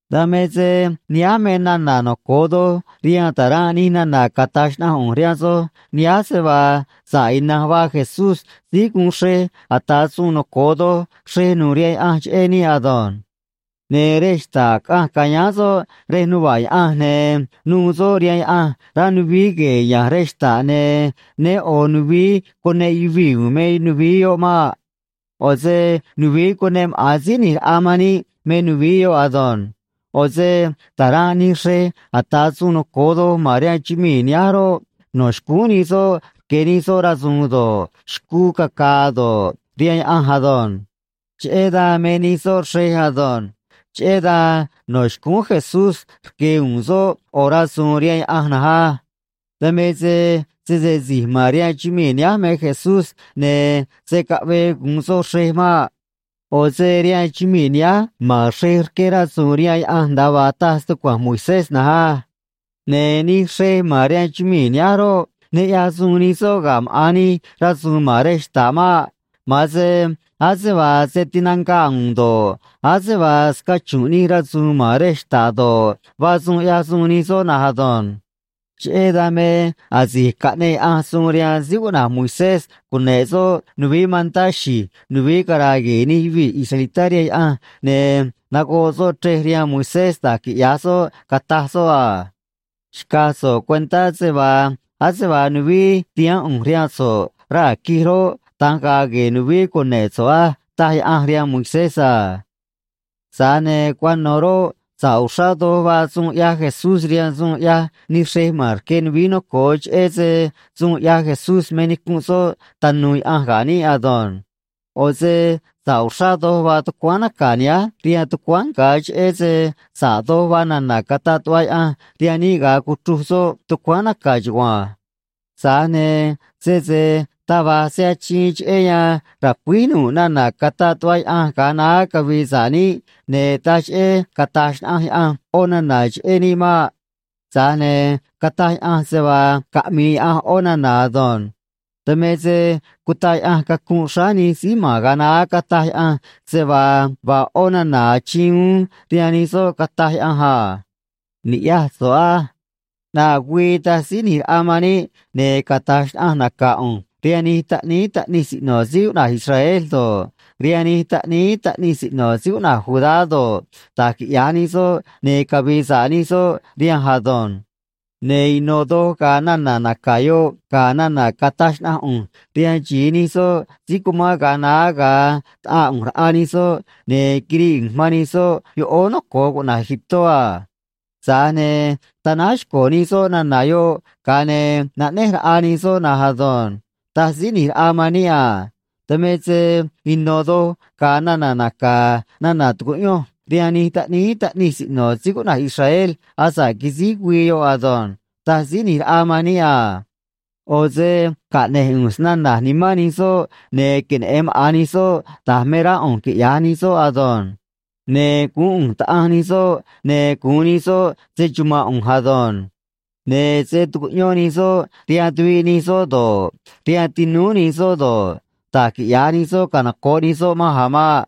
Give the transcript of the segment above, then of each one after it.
Dan me se nihánj me nana̱ noco̱o doj rihaan ta̱ranꞌ nij nana̱ cataj xnaꞌanj ꞌu̱nj rihaan soj nihánj, se vaa sa̱ꞌ ina̱nj vaa Jesús síí guun xrej ata̱ suun noco̱o doj xrej nu̱u̱ rihaan Yaꞌanj cheꞌé níꞌ ado̱nj. Ne̱ rej xta̱ꞌ caꞌanj ca̱yáán soꞌ rej nuva̱ꞌ Yaꞌanj, ne̱ nu̱u̱ soꞌ rihaan Yaꞌanj rá nuvií gue̱e̱ ya̱nj rej xta̱ꞌ, ne̱ né ꞌo̱ nuvií cuneꞌ yuvii̱ u̱u̱n me nuvií yoꞌ maꞌ. ꞌO̱ se nuvií cuneꞌ maꞌa̱n Síí ꞌNi̱j Raꞌa man níꞌ me nuvií yoꞌ ado̱nj. ꞌO̱ se ta̱ranꞌ nij xrej ata̱ suun noco̱o doj ma̱n rihaan chumii̱ nihánj roꞌ, no̱ xcúún nij soꞌ rque̱ nij soꞌ rasu̱u̱n do̱ꞌ, xcuu caca̱a̱ do̱ꞌ, rihaan Yaꞌanj ado̱nj. Cheꞌé dan me nij soꞌ xrej ado̱nj. Cheꞌé dan no̱ xcúún Jesús rque̱ uún soꞌ ꞌo̱ rasu̱u̱n rihaan Yaꞌanj na̱nj á. Dan me se sese si̱j ma̱n rihaan chumii̱ nihánj me Jesús, ne̱ se̱ caꞌvee gu̱un soꞌ xrej maꞌ. ꞌO̱ se rihaan chumii̱ nihánj ma̱n xrej rqué rasu̱u̱n rihaan Yaꞌanj nda̱a vaa taj stucua̱nj Moisés na̱nj á. Ne̱ nij xrej ma̱n rihaan chumii̱ nihánj roꞌ, ne ꞌyaj suun nij soꞌ ga̱ maꞌa̱n nij rasu̱u̱n ma̱n rej xta̱ꞌ maꞌ. Ma̱an se ase vaa se tinanga̱ꞌ u̱u̱n do̱ꞌ, ase vaa scachu̱nꞌ nij rasu̱u̱n ma̱n rej xta̱ꞌ do̱ꞌ, vaa suun ꞌyaj suun nij soꞌ na̱nj ado̱nj. Cheꞌé dan me asi̱j caꞌneꞌ Yaꞌanj suun rihaan síí cuꞌna̱j Moisés cune̱ꞌ soꞌ nuvií mantá xi̱j nuvií cara̱a̱ gue̱e̱ nij yuvii̱ israelitá rihaan Yaꞌanj, ne̱ nagoꞌ soꞌ chrej rihaan Moisés da̱j quiꞌya̱j soꞌ, cataj soꞌ a: “Xca̱j so̱ꞌ cuentá se vaa ase vaa nuvií tihaán ꞌu̱nj rihaan so̱ꞌ raa̱ quij roꞌ, da̱nj ga̱a̱ gue̱e̱ nuvií cune̱ꞌ so̱ꞌ á”, taj Yaꞌanj rihaan Moisés a. Tza̱j ne̱ cuano̱ roꞌ, sa̱ꞌ uxrá doj vaa suun ꞌyaj Jesús rihaan suun ꞌyaj nij xrej ma̱n rque nuvií noco̱o, cheꞌé se suun ꞌyaj Jesús me nicunꞌ soꞌ tanu̱u̱ Yaꞌanj ga̱ níꞌ ado̱nj. ꞌO̱ se sa̱ꞌ uxrá doj vaa tucuáán naca̱ nihánj rihaan tucuáán nga̱ cheꞌé se sa̱ꞌ doj vaa nana̱ cataꞌ tuꞌva Yaꞌanj rihaan níꞌ ga̱a cuchruj soꞌ tucuáán naca̱ chugua̱nj. Tza̱j ne̱ sese taj va̱j se achiin cheꞌé yan ra̱cuíj nu̱ꞌ nana̱ cataꞌ tuꞌva Yaꞌanj ga̱a naá cavi̱i̱ sa̱ꞌ níꞌ, ne̱ taj cheꞌé cata̱j xnaꞌanj Yaꞌanj ꞌó nana̱ cheꞌé níꞌ maꞌ. Tza̱j ne̱ cataj Yaꞌanj se vaa caꞌmi̱i̱ Yaꞌanj ꞌó nana̱ ado̱nj. Dan me se cutaꞌ Yaꞌanj cacunꞌ xráá nij síí ma̱n ga̱a naá, cataj Yaꞌanj se vaa vaa ꞌó nana̱ achiin uún rihaan nij soꞌ, cataj Yaꞌanj a: Ni̱ꞌyaj so̱ꞌ á. ꞌNaꞌ güii, taj Síí ꞌNi̱j Raꞌa man níꞌ, ne̱ cata̱j xnaꞌanj naca̱ ꞌu̱nj rihaan nij taꞌníí taꞌnij siꞌno̱ síí cuꞌna̱j Israel do̱ꞌ, rihaan nij taꞌníí taꞌnij siꞌno̱ síí cuꞌna̱j Judá do̱ꞌ, da̱j quiꞌya̱j nij soꞌ, ne̱ cavi̱i̱ sa̱ꞌ nij soꞌ rihanj ado̱nj. Ne̱ ino̱ doj ga̱a̱ nana̱ naca̱ yoꞌ ga̱ nana̱ cataj xnaꞌanj ꞌu̱nj rihaan xi̱i nij soꞌ si̱j cumán ga̱a naá, ga̱a taꞌaa ꞌu̱nj raꞌa nij soꞌ, ne̱ quirii ꞌu̱nj man nij soꞌ yoꞌóó noco̱o cuꞌna̱j Egiptó a. Tza̱j ne̱ tanáj xco̱ nij soꞌ nana̱ yoꞌ, ga̱a ne̱ naꞌnéj raꞌa nij soꞌ na̱nj ado̱nj, taj Síí ꞌNi̱j Raꞌa man níꞌ a. Dan me se ino̱ doj ga̱a̱ nana̱ naca̱ nana̱ tu̱cuꞌyonj rihaan nij taꞌníí taꞌnij siꞌno̱ síí cuꞌna̱j Israel asa̱ꞌ quisíj güii yoꞌ ado̱nj, taj Síí ꞌNi̱j Raꞌa man níꞌ a. ꞌO̱ se caꞌne̱j ꞌu̱nj snana̱j nimán nij soꞌ, ne̱ queneꞌe̱n maꞌa̱n nij soꞌ da̱j me rá ꞌu̱nj quiꞌya̱j nij soꞌ ado̱nj. Ne̱ guún ꞌu̱nj Taꞌanj nij soꞌ, ne̱ gu̱un nij soꞌ se‑chuma̱nꞌ ꞌu̱nj ado̱nj. Ne̱ se̱ tucuꞌyón nij soꞌ rihaan tuviꞌ nij soꞌ do̱ꞌ, rihaan tinúú nij soꞌ do̱ꞌ, da̱j quiꞌya̱j nij soꞌ canoco̱ꞌ nij soꞌ manj a̱ maꞌ.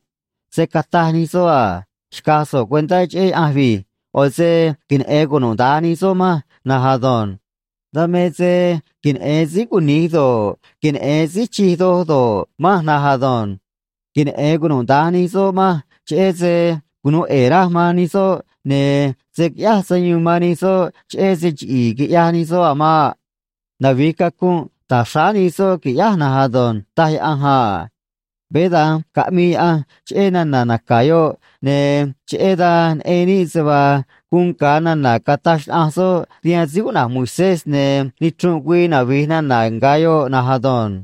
Se̱ cataj nij soꞌ a: “Xca̱j so̱ꞌ cuentá cheꞌé Yaꞌanj vi̱j.” ꞌO̱ se queneꞌe̱n cunuda̱nj nij soꞌ manj na̱nj ado̱nj. Dan me se queneꞌe̱n síí cuni̱j do̱ꞌ, queneꞌe̱n síí chij doj do̱ꞌ, manj na̱nj ado̱nj. Queneꞌe̱n cunuda̱nj nij soꞌ manj, cheꞌé se cunu̱u ꞌe̱e̱ raj man nij soꞌ, ne̱ se̱ quiꞌyáj sayuun man nij soꞌ cheꞌé se chiꞌi̱i̱ quiꞌyaj nij soꞌ a̱ maꞌ. Navi̱j cacunꞌ ta̱j xráá nij soꞌ, qui̱ꞌyáj na̱nj ado̱nj, taj Yaꞌanj a. Veé da̱nj caꞌmii Yaꞌanj cheꞌé nana̱ naca̱ yoꞌ, ne̱ cheꞌé dan neꞌen níꞌ se vaa guun nga̱ nana̱ cataj xnaꞌanj soꞌ rihaan síí cuꞌna̱j Moisés, ne̱ nichrunꞌ güii navi̱j nana̱ nga̱ yoꞌ na̱nj ado̱nj.